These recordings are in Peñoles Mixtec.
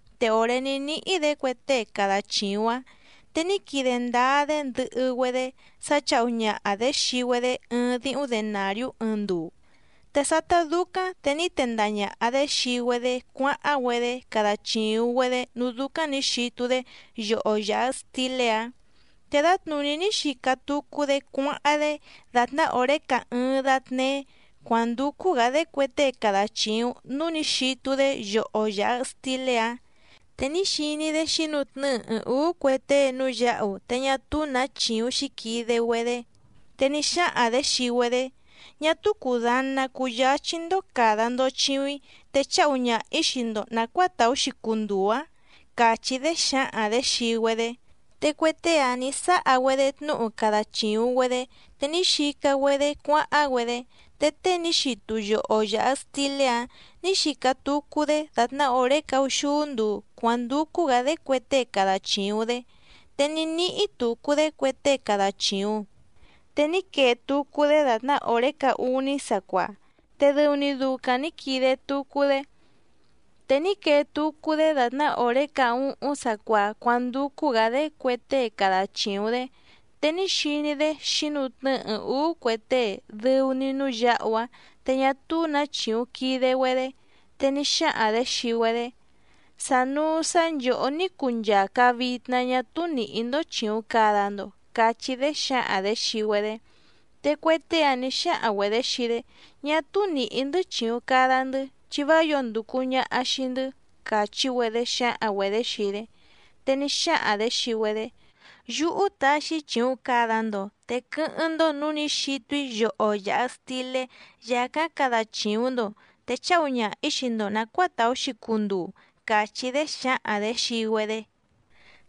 Te òré ní níhí‑dě cue tée cada chìuⁿ‑áⁿ, te ní quide ndáá‑dé ndɨhɨ‑güedé sá chǎhu ñaha‑dě xii‑güedé ɨɨⁿ díhúⁿ denàriú ɨɨⁿ nduu. Te sátá dúcáⁿ te ní tendaha ñàha‑dé xii‑güedé cuáháⁿ‑güedé cada chìuⁿ‑güedé núú dúcáⁿ nǐ xitu‑dé yoho yàha stilé‑áⁿ. Te dǎtnùní ní xica tucu‑dé cuáháⁿ‑dé dàtná òré caá ɨ́ɨ́ⁿ dátnéé cuǎndúcú‑gǎ‑dé cue tée cada chìuⁿ núú nǐ xitu‑dé yoho yàha stilé‑áⁿ, te ní xiní‑dé xǐnutnɨ́ɨ ɨɨⁿ ǔú cue tée núú yǎhu te ñá túú nǎ chìuⁿ xíquide‑güedé. Te ní xáhaⁿ‑dě xii‑güedé: “Ñá túú cùdana cuyáchí‑ndó càda‑ndo chiuⁿ‑í te cháhu ñaha‑ǐ xii‑ndo nàcuáa tàú‑xi cunduu‑ǎⁿ”, càchí‑dé xǎhaⁿ‑dě xii‑güedé. Te cue tée‑áⁿ nǐ sáha‑güedé tnúhu cada chìuⁿ‑güedé te ní xica‑güedé cuáháⁿ‑güedé. Te tée ní xitu yoho yàha stilé‑áⁿ nǐ xica tucu‑dé dàtná òré caúxúú nduu cuǎndúcú‑gǎ‑dé cue tée cada chìuⁿ‑dé, te ní níhí tucu‑dé cue tée cada chìuⁿ. Te ní quee tucu‑dé dàtná òré caá úní sacuaa, te dɨu‑ni ducaⁿ nǐ quide tucu‑dé. Te ní quee tucu‑dé dàtná òré caá úhúⁿ sacuaa cuándúcú‑gǎ‑dé cue tée cada chìuⁿ‑dé, te ní xiní‑dé xǐnutnɨ́ɨ ɨɨⁿ ǔú cue tée dɨu‑ni núú yǎhu‑áⁿ te ñá túú nǎ chìuⁿ quide‑güedé, te ní xáhaⁿ‑dě xii‑güedé: “Sànuu sá nchòhó ní cuu nchàca vitna ñá túú nìhí‑ndó chìuⁿ cada‑ndo”, cachí‑dé xǎhaⁿ‑dě xii‑güedé. Te cue tée‑áⁿ nǐ xáhaⁿ‑güedě xii‑dé: “Ñá túú nìhí‑ndɨ́ chìuⁿ cada‑ndɨ́ chi vá yǒo ndùcu ñaha xii‑ndɨ́”, càchí‑güedé xǎhaⁿ‑güedě xii‑dé. Te ní xáhaⁿ‑dě xii‑güedé: “Yúhú taxi‑í chìuⁿ cada‑ndo, te quɨ́hɨ́ⁿ‑ndó nǔú nǐ xitu‑í yoho yàha stilé yàcáⁿ cada chìuⁿ‑ndo, te cháhu ñaha‑ǐ xii‑ndo nàcuáa tàú‑xi cunduu”, càchí‑dé xǎhaⁿ‑dě xii‑güedé.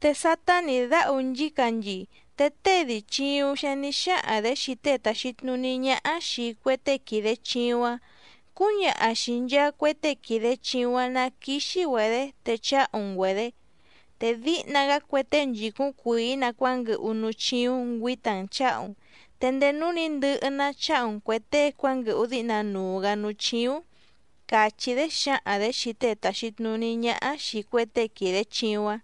Te sátá nǐ dáhu nchícanchii, te tée dii chìuⁿ‑xi‑áⁿ nǐ xáhaⁿ‑dě xii tée tàxi tnuní ñáhá xìi cue tée quìde chiuⁿ‑áⁿ: “Cúñaha xìi nchaa cue tée quìde chiuⁿ‑áⁿ ná quíxí‑güedě te cháhu‑n‑güedě, te díhna‑gá cue tée nchìcúⁿ cuìí‑nǎ cuánguɨhu núú chíúⁿ ngüǐta‑n chǎhu‑n, te ndéé núú nǐ ndɨhɨ‑ná cháhu‑n cuè tée cuánguɨhu díhna nuu‑gǎ núú chíúⁿ”, càchí‑dé xǎhaⁿ‑dě xii tée tàxi tnuní ñáhá xìi cue tée quìde chiuⁿ‑áⁿ.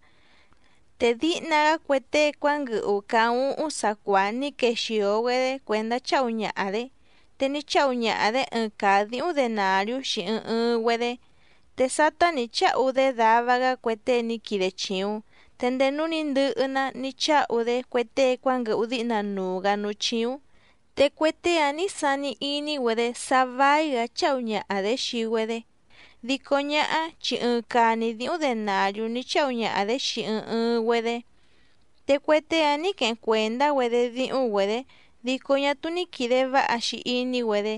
Te díhna‑gá cue tée cuánguɨhu caá úhúⁿ sacuaa ní quexìo‑güedé cuèndá cháhu ñaha‑dě, te ní cháhu ñaha‑dě ɨɨⁿ caa dǐhúⁿ denàriú xii ɨɨⁿ ɨɨⁿ‑güedé. Te sátá nǐ cháhu‑dé dava‑gá cue tée ní quide chìuⁿ. Te ndéé núú nǐ ndɨhɨ‑ná ní cháhu‑dé cue tée cuánguɨhu díhna nuu‑gǎ núú chíúⁿ. Te cue tée‑áⁿ nǐ sani iní‑güedé sá váí‑gǎ cháhu ñaha‑dě xii‑güedé, dico ñáhá chi ɨɨⁿ caa‑ni díhúⁿ denàriú ní cháhu ñaha‑dě xii ɨɨⁿ ɨɨⁿ‑güedé. Te cue tée‑áⁿ nǐ queheⁿ cuèndá‑güedé díhúⁿ‑güedě dico ñá túú ní quìde váha‑xi iní‑güedé.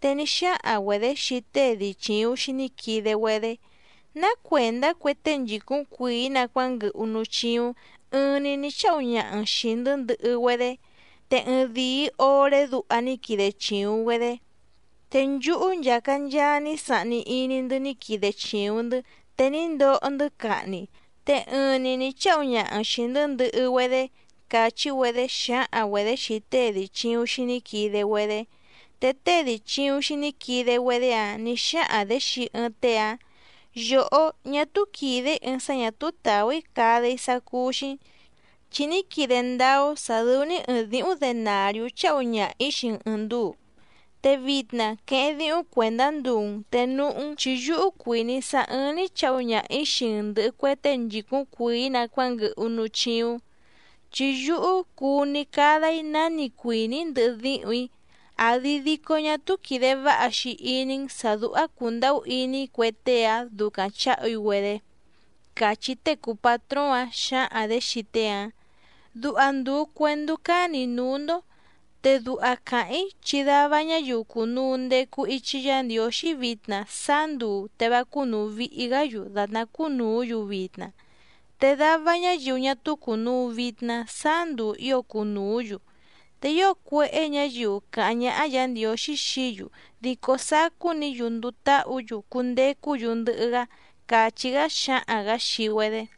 Te ní xáhaⁿ‑güedě xii tée dii chìuⁿ‑xi ní quide‑güedé: “¿Ná cuèndá cue tée nchìcúⁿ cuìí‑nǎ cuánguɨhu núú chíúⁿ ɨɨⁿ‑ni nǐ cháhu ñaha‑n xìi‑ndɨ́ ndɨhɨ‑güedé, te ɨɨⁿdìi oré duha ní quide chìuⁿ‑güedé? Te nchúhú nchàca nchaa ní sahni iní‑ndɨ́ ní quide chìuⁿ‑ndɨ́, te ní ndoho‑ndɨ́ cahni, te ɨɨⁿ‑ni nǐ cháhu ñaha‑n xìi‑ndɨ́ ndɨhɨ‑güedé”, càchí‑güedé xǎhaⁿ‑güedě xii tée dii chìuⁿ‑xi ní quide‑güedé. Te tée dii chìuⁿ‑xi ní quide‑güedé‑áⁿ nǐ xáhaⁿ‑dě xii ɨɨⁿ tée‑áⁿ: “Yòhó, ñá túú quìde‑í ɨɨⁿ sá ñà túú tàú‑í cada‑í sá cúú‑xí‑n, chi ní quide ndáá‑ó sǎ dɨ́ú‑ní ɨ̀ɨⁿ díhúⁿ denàriú cháhu ñaha‑ǐ xii‑n ɨ̀ɨⁿ nduu. Te vitna queheⁿ díhúⁿ cuèndá nduu‑n te núhú‑n, chi yúhú cuìní‑í sá ɨ́ɨ́ⁿ‑ní chǎhu ñaha‑ǐ xii‑n ndɨ̀hɨ cue tée nchìcúⁿ cuìí‑nǎ cuánguɨhu núú chíúⁿ. Chi yúhú cuu‑ni cada‑í náni cuìní‑í ndɨhɨ díhùⁿ‑í, ¿àdi dico ñá túú quìde váha‑xi iní‑n sǎ dúhá cùndahú iní‑í cue tée‑ǎⁿ ducaⁿ chǎhu‑í‑güedé?”, càchí tée cùu patróóⁿ‑áⁿ xǎhaⁿ‑dě xii tée‑áⁿ. Duha ndùu cuendú cánì‑í núú‑ndó. Te duha càháⁿ‑í chi dava ñáyiu cùnuu ndecu ichi Yá Ndiǒxí vitna sáá nduu te vá cúnùu vihi‑gá‑yu dàtná cúnùú‑yu vitna, te dava ñáyiu ñá túú cùnuu vitna sáá nduu ǐo cunùú‑yu. Te ío cuéhé ñǎyiu càháⁿ ñáhá Yǎ Ndiǒxí xií‑yu dico sacú‑ni‑yu nduu táhǔ‑yu cundecú‑yu ndɨhɨ‑gá —càchí‑gá xǎhaⁿ‑gǎ xii‑güedé.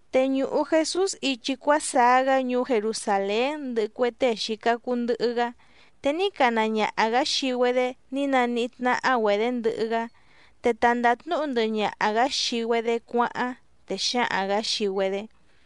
Te ñùhu Jesús ichi cuásaá‑gá ñuú Jerusàlén ndɨhɨ cue tée xìca cuu ndɨhɨ‑gá, te ní cana ñaha‑gǎ xii‑güedé ní naníhí tnáhá‑güedě ndɨhɨ‑gá, te ta ndàtnúhu ndɨhɨ ñaha‑gǎ xii‑güedé cuáháⁿ, te xǎhaⁿ‑gǎ xii‑güedé: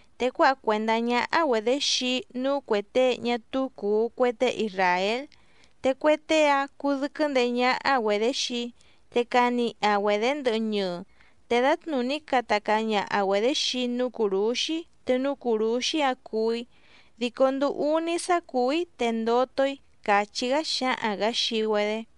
Te cuáha cuèndá ñáhá‑güedě xii‑í núú cuè tée ñá túú cùu cue tée isràél, te cue tée‑áⁿ cudɨ́quɨ́ ndeé ñáhá‑güedě xii‑í, te caniha‑güedě ndɨhɨ ñɨɨ, te dǎtnùní cata caa ñaha‑güedě xii‑í núú cùrúxí te núú cùrúxí‑áⁿ cuú‑í, dico nduu úní sá cùú‑í te ndoto‑í —càchí‑gá xǎhaⁿ‑gǎ xii‑güedé.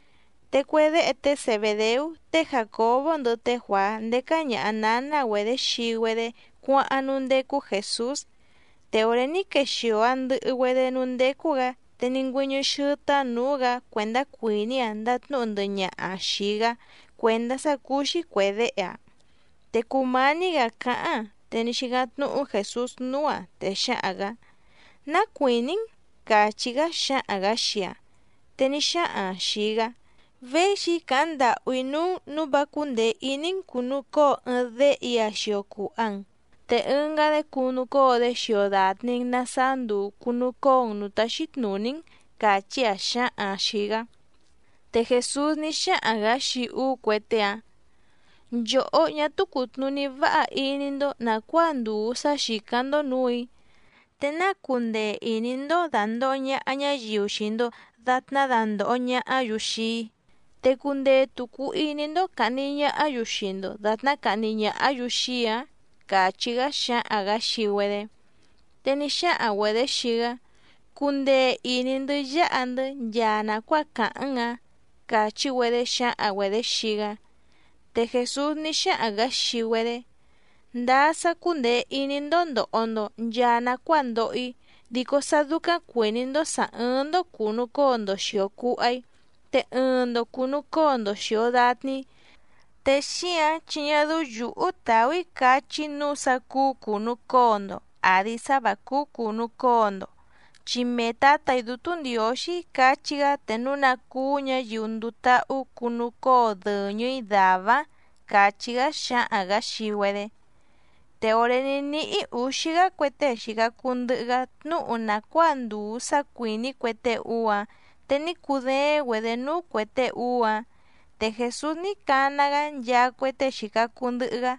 Te cue déhe té Zebèdeú té Jàcobó ndɨhɨ té Juàá ndécá ñàha náná‑güedě xii‑güedé cuáháⁿ núú ndécú Jèsús, te òré ní quexìo‑aⁿ ndɨhɨ‑güedé núú ndécú‑gǎ te ní ngüɨ́ñɨ́ xɨ́tɨ́‑áⁿ nǔú‑gǎ cuèndá cuìní‑aⁿ ndàtnúhu ndɨhɨ ñaha‑aⁿ xìi‑gá cuèndá sá cúú‑xí cuè déhe‑aⁿ. Te cùmání‑gǎ cáháⁿ‑aⁿ te ní xícáⁿ tnúhú Jèsús núú‑aⁿ, te xǎhaⁿ‑gǎ: —¿Ná cuìní‑n? —càchí‑gá xǎhaⁿ‑gǎ xii‑aⁿ. Te ní xáhaⁿ‑aⁿ xìi‑gá: —Véxi‑í càháⁿ ndàhú‑í núú‑n nǔu vá cúndèe iní‑n cùnucóo ɨɨⁿ déhe‑í‑a xio cùha‑n, te ɨngá‑dé cunucóo‑dé xio dàtni‑n na saá nduu cùnucóo‑n nǔú táxí tnùní‑n —càchí‑áⁿ xǎhaⁿ‑aⁿ xìi‑gá. Te Jèsús ní xáhaⁿ‑gǎ xii úú cue tée‑áⁿ: —Nchòhó, ñá túú cùtnuní váha iní‑ndó nàcuáa ndùu sá xìcáⁿ‑ndó nǔù‑í. ¿Te náa cundee ìní‑ndó dàndoho ñaha ñáyiu xii‑ndo dàtná dandòho ñahá‑yu xii‑í, te cundee tùcu iní‑ndó càhni ñahá‑yu xii‑ndo dàtná cahni ñàhá‑yu xii‑í‑ǎⁿ? —càchí‑gá xǎhaⁿ‑gǎ xii‑güedé. Te ní xáhaⁿ‑güedě xii‑gá: —Cundee ìní‑ndɨ́ yáha‑ndɨ́ nchaa nàcuáa càháⁿ‑n‑ǎⁿ —càchí‑güedé xǎhaⁿ‑güedě xii‑gá. Te Jèsús ní xáhaⁿ‑gǎ xii‑güedé: —Ndáá sá cúndèe iní‑ndó ndòho‑ndo nchaa nacuáa ndoho‑í, dico sá dúcáⁿ cuìní‑ndó sǎ ɨ́ɨ́ⁿ‑ndó cùnucóo‑ndo xìo cuha‑í, te ɨɨⁿ‑ndo cùnucóo‑ndo xìo datni‑í, te xíǎⁿ chi ñá dɨ́ú yǔhú tàú‑í cachí‑í nǔu sá cúú cùnucóo‑ndo àdi sá vǎ cúú cùnucóo‑ndo, chi mee Tǎtà‑í Dútú Ndiǒxí cachí‑gá te núu ná cúú ñǎyiu nduu táhú cunucóo dɨ̀ñɨ‑í dàvá‑áⁿ —càchí‑gá xǎhaⁿ‑gǎ xii‑güedé. Te òré ní níhí ǔxí‑gá cue tée xìca cuu ndɨhɨ‑gá tnúhu nàcuáa ndùu sá cuìní cue tée úú‑áⁿ, te ní cudééⁿ‑güedě núú cuè tée úú‑áⁿ. Te Jèsús ní cana‑gá nchaa cue tée xìca cuu ndɨhɨ‑gá,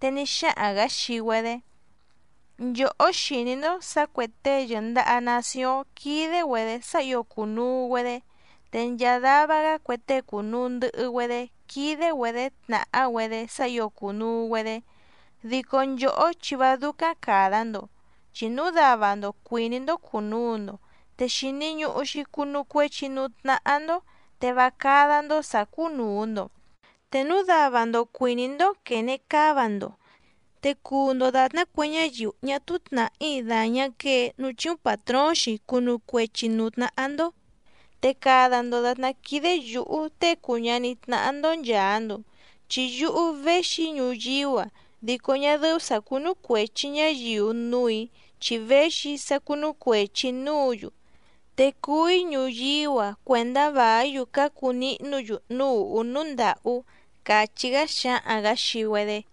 te ní xáhaⁿ‑gǎ xii‑güedé: —Nchòhó xìní‑ndó sǎ cuè tée yɨ̀ndaha nacióⁿ quídé‑güedě sá ǐo cùnuu‑güedé, te nchaa dava‑gá cue tée cùnuu ndɨhɨ‑güedé quídé‑güedě tnàhá‑güedé sá ǐo cùnuu‑güedé. Dico nchòhó chi vá dúcáⁿ càda‑ndo, chi núu dava‑ndo cuìní‑ndó cùnuu‑ndo, te xìni ñuhu‑xi cunu cuechi núú tnáhá‑ndó te vá cádá‑ndó sǎ cúnùu‑ndo. Te núu dava‑ndo cuìní‑ndó quène cáva‑ndo, te cuu‑ndo dàtná cue ñáyiu ñá túú tnàhí dàñá quee núú chíúⁿ pàtróóⁿ‑xi cunu cuechi nǔú tnáhá‑ndó. Te cada‑ndo dàtná quídé yǔhú Tée cùu ñaní tnáhá‑ndó nchàa‑ndo, chi yúhú véxi‑í ñuyíú‑a dico ñá dɨ́ú sǎ cúnú cuèchi ñáyiu núù‑í chi véxi‑í sá cúnú cuèchi‑í núǔ‑yu. Te cuú‑í ñuyíú‑a cuèndá vàí‑yu cácu nihnú‑yu núú ùhú núú ndàhú —càchí‑gá xǎhaⁿ‑gǎ xii‑güedé.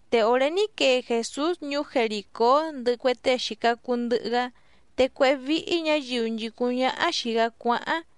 Te òré ní quee Jèsús ñuú Jerìcó ndɨhɨ cue tée xìca cuu ndɨhɨ‑gá, te cuéhé víhí ñǎyiu nchìcúⁿ ñáhá xìi‑gá cuáháⁿ.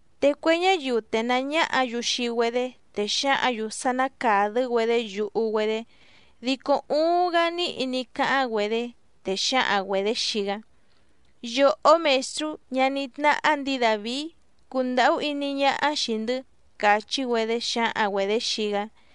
Te cue ñáyiu tènaá ñáhǎ‑yu xii‑güedé, te xǎhǎⁿ‑yu sá ná càdɨ́‑güedé yuhu‑güedé, dico uuⁿ‑gá níhi ní cáháⁿ‑güedé, te xǎhaⁿ‑güedě xii‑gá: —¡Yòhó Mèstrú, ñaní tnáhá ndǐi Dàvií, cundàhú iní ñáhá xìi‑ndɨ́! —càchí‑güedé xǎhaⁿ‑güedě xii‑gá.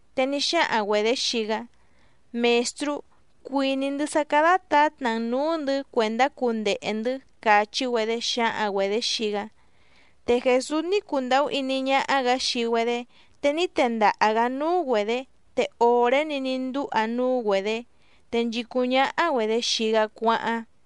Te ní xáhaⁿ‑güedě xii‑gá: —Mèstrú, cuìní‑ndɨ́ sá cádá tǎtna‑n nǔú‑ndɨ̌ cuèndá cundehe‑ndɨ̌ —càchí‑güedé xǎhaⁿ‑güedě xii‑gá. Te Jèsús ní cundàhú iní ñáhá‑gǎ xii‑güedé, te ní tendaha‑gǎ núú‑güedě. Te òré‑ni ní ndúha núú‑güedě, te nchìcúⁿ ñáhá‑güedě xii‑gá cuáháⁿ.